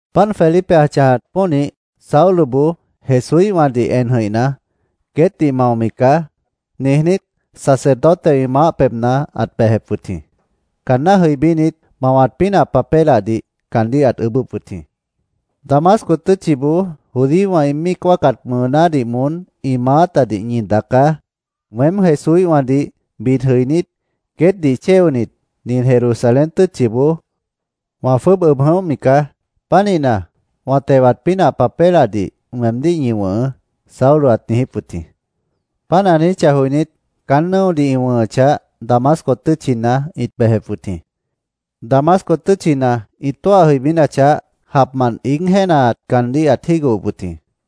Páant Felipe ã chãjat pónih, Sauloboó Jesúíhwãdih en jʉ̃ihna, “Queétdih maomi caá”, niijnít, sacerdotewã ĩ maáh pebhna ãt bejep wʉt jĩ. Caanná jʉibínit, mawat pínah papélahdih caandíh ãt ʉʉ́bʉ́p wʉt jĩ. “Damasco tʉ́tchiboó judíowã ĩ míic wáacat mʉʉnádih moón ĩ maátadih ñi daacá. Weém Jesúíhwãdih bid jʉinít, queétdih chéonit, nin Jerusalén tʉ́tchiboó wã jwʉ́ʉb ʉb jʉ̃óhmi caá. Pánihna, wã tewat pínah papélahdih weemdíh ñi wʉ̃hʉʉ́”, Saulo ãt niijíp wʉt jĩ. Páant ã niijíchah joinít, caán nʉ́odih ĩ wʉ̃hʉchah, Damasco tʉ́tchina ĩt bejep wʉt jĩ. Damasco tʉ́tchina ĩ tóah jʉibínachah, japmant iíg jéenaat caandíh ãt jígohop wʉt jĩ.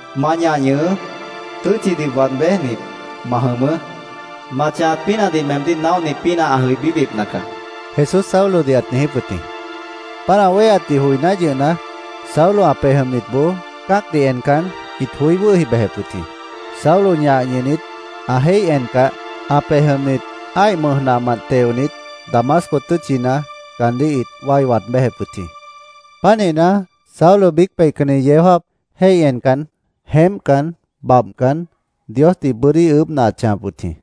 Ma ñah ñʉhʉʉ́. Tʉ́tchidih waad béjnit, ma jʉmʉʉ́. Ma chãjat pínahdih meemdíh naóhni pínah ã jʉibíbipna caá”, Jesús Saulodih ãt niijíp wʉt jĩ. Páant ã wéheatdih joiná yʉhna, Saulo ã pej jʉmnitboó cã́acdih encan, ĩt joí wʉ́hi bejep wʉt jĩ. Saulo ñah ñʉhnit, ã jéih encah, ã pej jʉmnit ã́ih mʉj nahmant teonit, Damasco tʉ́tchina caandíh ĩt wái waad béjep wʉt jĩ. Pánihna, Saulo biíc peihcanni yeó jáap jéih encan, jeémpcan, babhcan, Diosdih bʉ́dí ʉʉ́bhna ãt chãjap wʉt jĩ.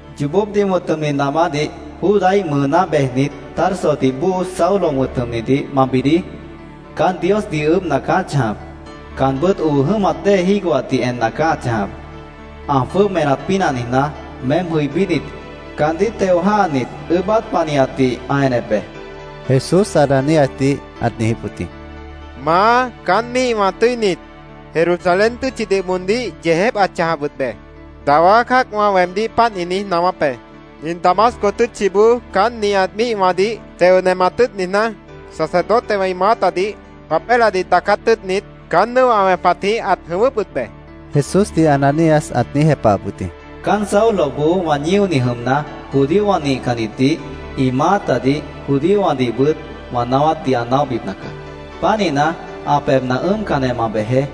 “Yoobópdih wʉ̃t jʉmni namádih, Judáíh mʉʉná bejnit, Tarsodih bóo Saulo wʉ̃t jʉmnidih ma bidií. Caán Diosdih ʉʉ́bhna caá ã chãjap. Caanbʉ́t oo jʉ́mat dée jígohatdih enna caá ã chãjap. Ã jwʉ́ʉb enat pínah niijná, meém jʉibínit, caandíh teo jã́hanit, ʉʉ́bát panihatdih ã enep be”, Jesús Ananíasdih ãt niijíp wʉt jĩ. “Maá, caán míihwã tʉ́init, Jerusalén tʉ́tchidih moondíh yeejép ãt chãjap wʉt be. Dawá cã́acwã weemdíh páant ĩ niíj naáwáp be. Nin Damasco tʉ́tchiboó caán nihat míihwãdih teo nemat tʉ́ʉt niijná, sacerdotewã ĩ maátadih papélahdih daacát tʉ́ʉtnit, caán nʉ́o ã wẽpatjĩh ãt jʉ̃ʉ́wʉ́p wʉt be”, Jesúsdih Ananías ãt niíj jepahap wʉt jĩ. “Caán Sauloboó wã ñíoni jʉmna, judíowã nihcannitdih, ĩ maátadih, judíowãdihbʉt wã naáwátdih ã naóhbipna caá. Pánihna, ã pebhna ʉ́ʉmcanjeh ma bejeé.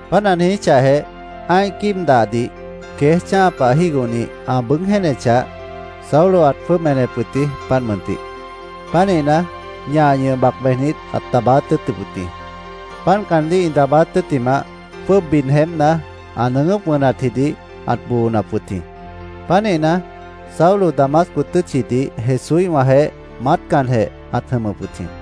Páant ã niijíchahjeh, ã́ih quíib dahdih queéj chã́a pah jígohni ã bʉʉ́g jéenechah, Saulo ãt jwʉ́ʉb enep wʉt jĩ, páant mʉntih. Pánihna, ñah ñʉh bac bejnit, ãt daabáát tʉ́ʉtʉp wʉt jĩ. Páant caandíh ĩ daabáát tʉ́ttimah, jwʉ́ʉb bid jeémpna, ã nʉʉgʉ́p wʉnatji ãt boonap wʉt jĩ. Pánihna, Saulo Damasco tʉ́tchidih Jesúíhwãjeéh maátcanjeh ãt jʉmʉp wʉt jĩ.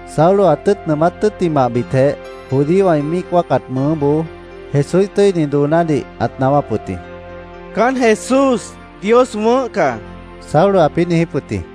Saulo ã tʉ́ʉt nʉʉmát tʉ́ttimahbitjeh, judíowã ĩ míic wáacat mʉʉnáboó Jesúíh tʉ́ini doonádih ãt naáwáp wʉt jĩ. —Caán Jesús Dios wʉ̃ʉ́h caá, Saulo ãpĩ́ niijíp wʉt jĩ.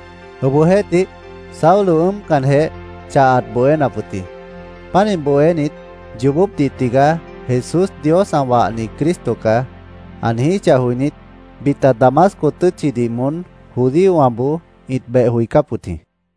Obohjeéhtih, Saulo ʉ́ʉmcanjeh, chah ãt bohénap wʉt jĩ. Pánih bohénit, “Yoobópdih tigaá Jesús Dios ã wahni Cristo caá”, ã niijíchah joinít, bita Damasco tʉ́tchidih moón judíowãboó ĩt beh joicáp wʉt jĩ.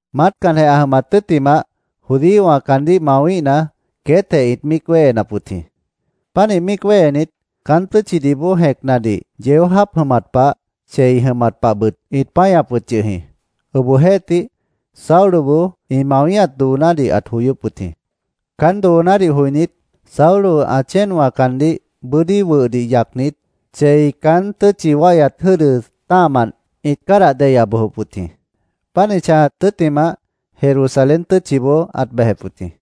Maátcanjeh ã jʉmat tʉ́ttimah, judíowã caandíh mawíhna, queétjeh ĩt míic wéhenap wʉt jĩ. Pánih míic wéhenit, caán tʉ́tchidih bóo jẽcnadih yeó jáap jʉmat pah, chei jʉmat pahbʉt ĩt páñap wʉt yʉh jĩ. Obohjeéhtih, Sauloboó ĩ mawíhat doonádih ãt joyóp wʉt jĩ. Caán doonádih joinít, Saulo ã chéenwã caandíh bʉ́dí wʉhdih yacnit, chei caán tʉ́tchi wáihyat jʉ́dʉ tã́ahmant ĩt cádah deya bojop wʉt jĩ. Páant ĩ chãjat tʉ́ttimah, Jerusalén tʉ́tchiboó ãt bejep wʉt jĩ.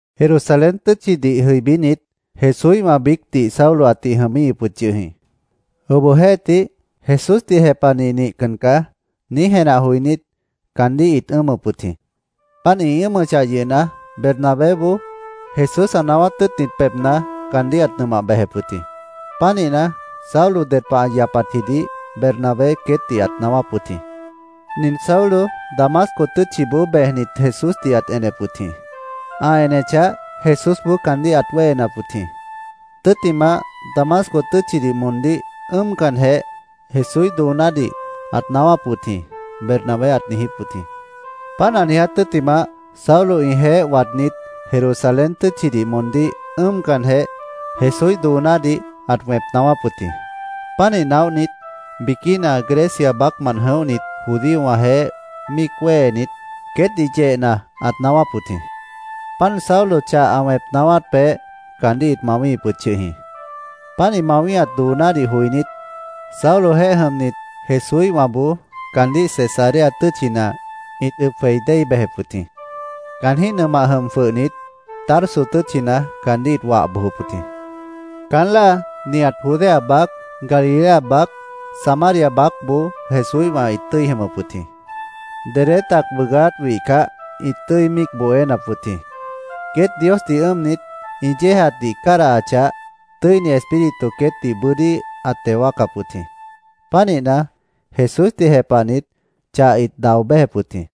Jerusalén tʉ́tchidih jʉibínit, Jesúíhwã biícdih Saulo ãtih jʉmíhip wʉt yʉh jĩ. Obohjeéhtih, “Jesúsdih jepahni nihcan caá”, niíj jenah joinít, caandíh ĩt ʉ́ʉmʉp wʉt jĩ. Páant ĩ ʉ́ʉmʉchah yʉhna, Bernabéboó Jesús ã naáwát tʉ́ʉtnit pebhna caandíh ãt nʉmah bejep wʉt jĩ. Pánihna, Saulo ded pah ã yapatjidih Bernabé queétdih ãt naáwáp wʉt jĩ: “Nin Saulo Damasco tʉ́tchiboó bejnit, Jesúsdih ãt enep wʉt jĩ. Ã enechah, Jesúsboó caandíh ãt wéhenap wʉt jĩ. Tʉ́ttimah, Damasco tʉ́tchidih moondíh ʉ́ʉmcanjeh, Jesúíh doonádih ãt naáwáp wʉt jĩ”, Bernabé ãt niijíp wʉt jĩ. Páant ã niiját tʉ́ttimah, Saulo ĩjeéh waadnít, Jerusalén tʉ́tchidih moondíh ʉ́ʉmcanjeh, Jesúíh doonádih ãt wẽp naáwáp wʉt jĩ. Pánih naóhnit, biquína Grecia baácmant jʉ̃óhnit judíowãjeéh míic wéhenit, queétdih yehna ãt naáwáp wʉt jĩ. Páant Saulo chah ã wẽp naáwát peéh caandíh ĩt mawíhip wʉt yʉh jĩ. Páant ĩ mawíhat doonádih joinít, Saulojeéh jʉmnit Jesúíhwãboó caandíh Cesarea tʉ́tchina ĩt ʉb jwei déi bejep wʉt jĩ. Caanjĩ́h nʉmah jʉm jwʉhnit, Tarso tʉ́tchina caandíh ĩt wah bojop wʉt jĩ. Caán láa nihat Judea baác, Galilea baác, Samaria baácboó Jesúíhwã ĩt tʉ́i jʉmʉp wʉt jĩ. Dedé tac bʉʉgáát wihcah, ĩt tʉ́i míic bohénap wʉt jĩ. Queét Diosdih ʉ́ʉmnit, ĩ yéejatdih cádahachah, Tʉ́ini Espíritu queétdih bʉ́dí ãt teo wáacap wʉt jĩ. Pánihna, Jesúsdih jepahnit chah ĩt dao béjep wʉt jĩ.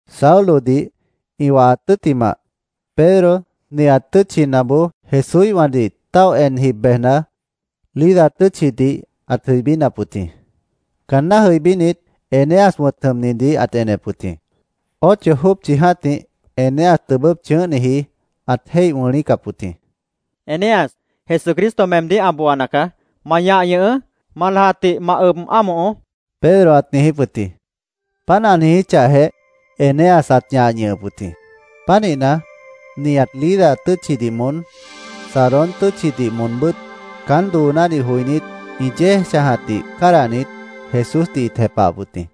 Saulodih ĩ wahat tʉ́ttimah, Pedro nihat tʉ́tchinaboó Jesúíhwãdih táoh en jib bejna, Lida tʉ́tchidih ãt jʉibínap wʉt jĩ. Caanná jʉibínit, Eneas wʉ̃t jʉmnidih ãt enep wʉt jĩ. Ocho jópchi jã́tih Eneas tʉbʉ́p chʉ̃ʉ́hniji ãt jéih wʉ̃lícap wʉt jĩ. —Eneas, Jesucristo meemdíh ã booana caá. Ma ñah ñʉhʉʉ́. Ma lajatdih ma ʉb ámohoó, Pedro ãt niijíp wʉt jĩ. Páant ã niijíchahjeh, Eneas ãt ñah ñʉhʉp wʉt jĩ. Pánihna, nihat Lida tʉ́tchidih moón, Sarón tʉ́tchidih moonbʉ́t caán doonádih joinít, ĩ yéej chãjatdih cádahnit, Jesúsdih ĩt jepahap wʉt jĩ.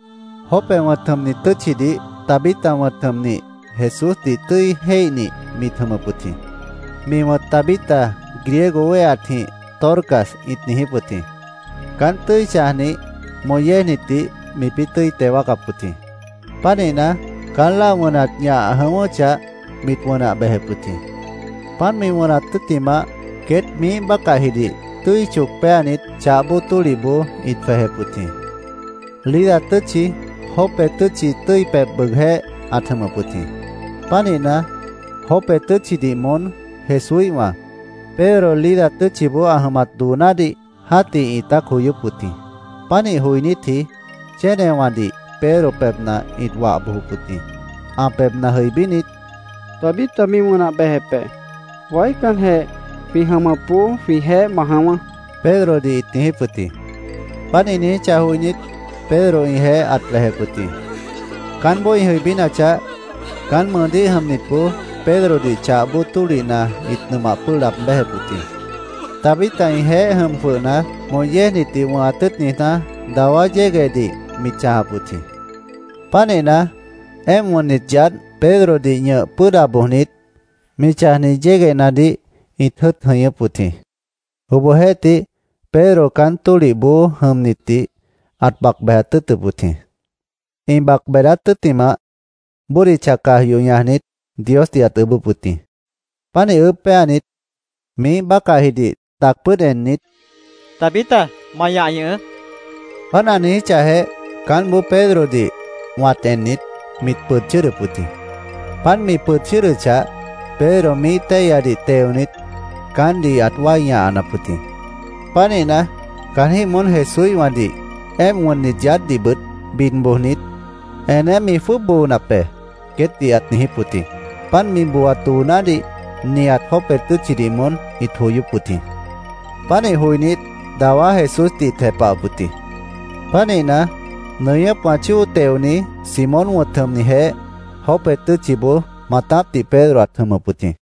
Jope wʉ̃t jʉmni tʉ́tchidih Tabita wʉ̃t jʉmnih Jesúsdih tʉ́i jéihnih mit jʉmʉp wʉt jĩ. Mi wʉ̃t Tabita griego wéheatjĩh Dorcas ĩt niijíp wʉt jĩ. Caánt tʉ́i chãjnih, moh yéejnitdih mipĩ́ tʉ́i teo wáacap wʉt jĩ. Pánihna, caán láa wʉnat ñah jʉ̃ʉ́wʉ́chah, mit wʉnah bejep wʉt jĩ. Páant mi wʉnat tʉ́ttimah, queét miíh bácahjidih tʉ́i choc péanit, chah bóo tólihboó ĩt jwejep wʉt jĩ. Lida tʉ́tchi Jope tʉ́tchi tʉ́i pebh bʉʉgjéh ãt jʉmʉp wʉt jĩ. Pánihna, Jope tʉ́tchidih moón Jesúíhwã, Pedro Lida tʉ́tchiboó ã jʉmat doonádih jã́tih ĩtát joyóp wʉt jĩ. Pánih joinítji chénewãdih Pedro pebhna ĩt wah bojop wʉt jĩ. Ã pebhna jʉibínit, “Tabita mi wʉnah bejep be. Waícanjeh jwĩ jʉmʉpboó jwĩjeéh ma jʉ̃ʉ́wʉ́”, Pedrodih ĩt niijíp wʉt jĩ. Páant ĩ niijíchah joinít, Pedro ĩjeéh ãt bejep wʉt jĩ. Caánboó ĩ jʉibínachah, caán mʉʉdíh jʉmnitboó Pedrodih chah bóo tólihna ĩt nʉmah pʉ́ʉh laab béjep wʉt jĩ. Tabita ĩjeéh jʉm jwʉhna, moh yéejnitdih wʉ̃hat tʉ́ʉt niijná, dawá yéguehdih mit chãjap wʉt jĩ. Pánihna, éemp wʉnnit yaádh Pedrodih ñʉh pʉ́ʉda bojnit, mi chãjniji yéguehnadih ĩt jʉ́ʉt jʉñʉ́p wʉt jĩ. Obohjeéhtih, Pedro caán tólihboó jʉmnitdih ãt bac bejat tʉ́ʉtʉp wʉt jĩ. Ĩ bac beedáát tʉ́ttimah, bódicha caj yoh ñajnit, Diosdih ãt ʉʉ́bʉ́p wʉt jĩ. Pánih ʉʉ́bh péanit, miíh bácahjidih tac pʉ́ʉd ennit, —Tabita, ma ñah ñʉhʉʉ́, ãt niijíp wʉt jĩ. Páant ã niijíchahjeh, caántboó Pedrodih wãt ennit, mit pʉd chʉ́ʉdʉp wʉt jĩ. Páant mi pʉd chʉ́ʉdʉchah, Pedro miíh téihyadih teonit, caántdih ãt wái ñahanap wʉt jĩ. Pánihna, caanjĩ́h moón Jesúíhwãdih, éemp wʉnnit yaádhdihbʉt bid bojnit, “Eneé mi jwʉ́ʉb boonap be”, queétdih ãt niijíp wʉt jĩ. Páant mi booat doonádih nihat Jope tʉ́tchidih moón ĩt joyóp wʉt jĩ. Pánih joinít, dawá Jesúsdih ĩt jepahap wʉt jĩ. Pánihna, nʉñʉ́pwã chóo teoni, Simón wʉ̃t jʉmnijeéh Jope tʉ́tchiboó maatápdih Pedro ãt jʉmʉp wʉt jĩ.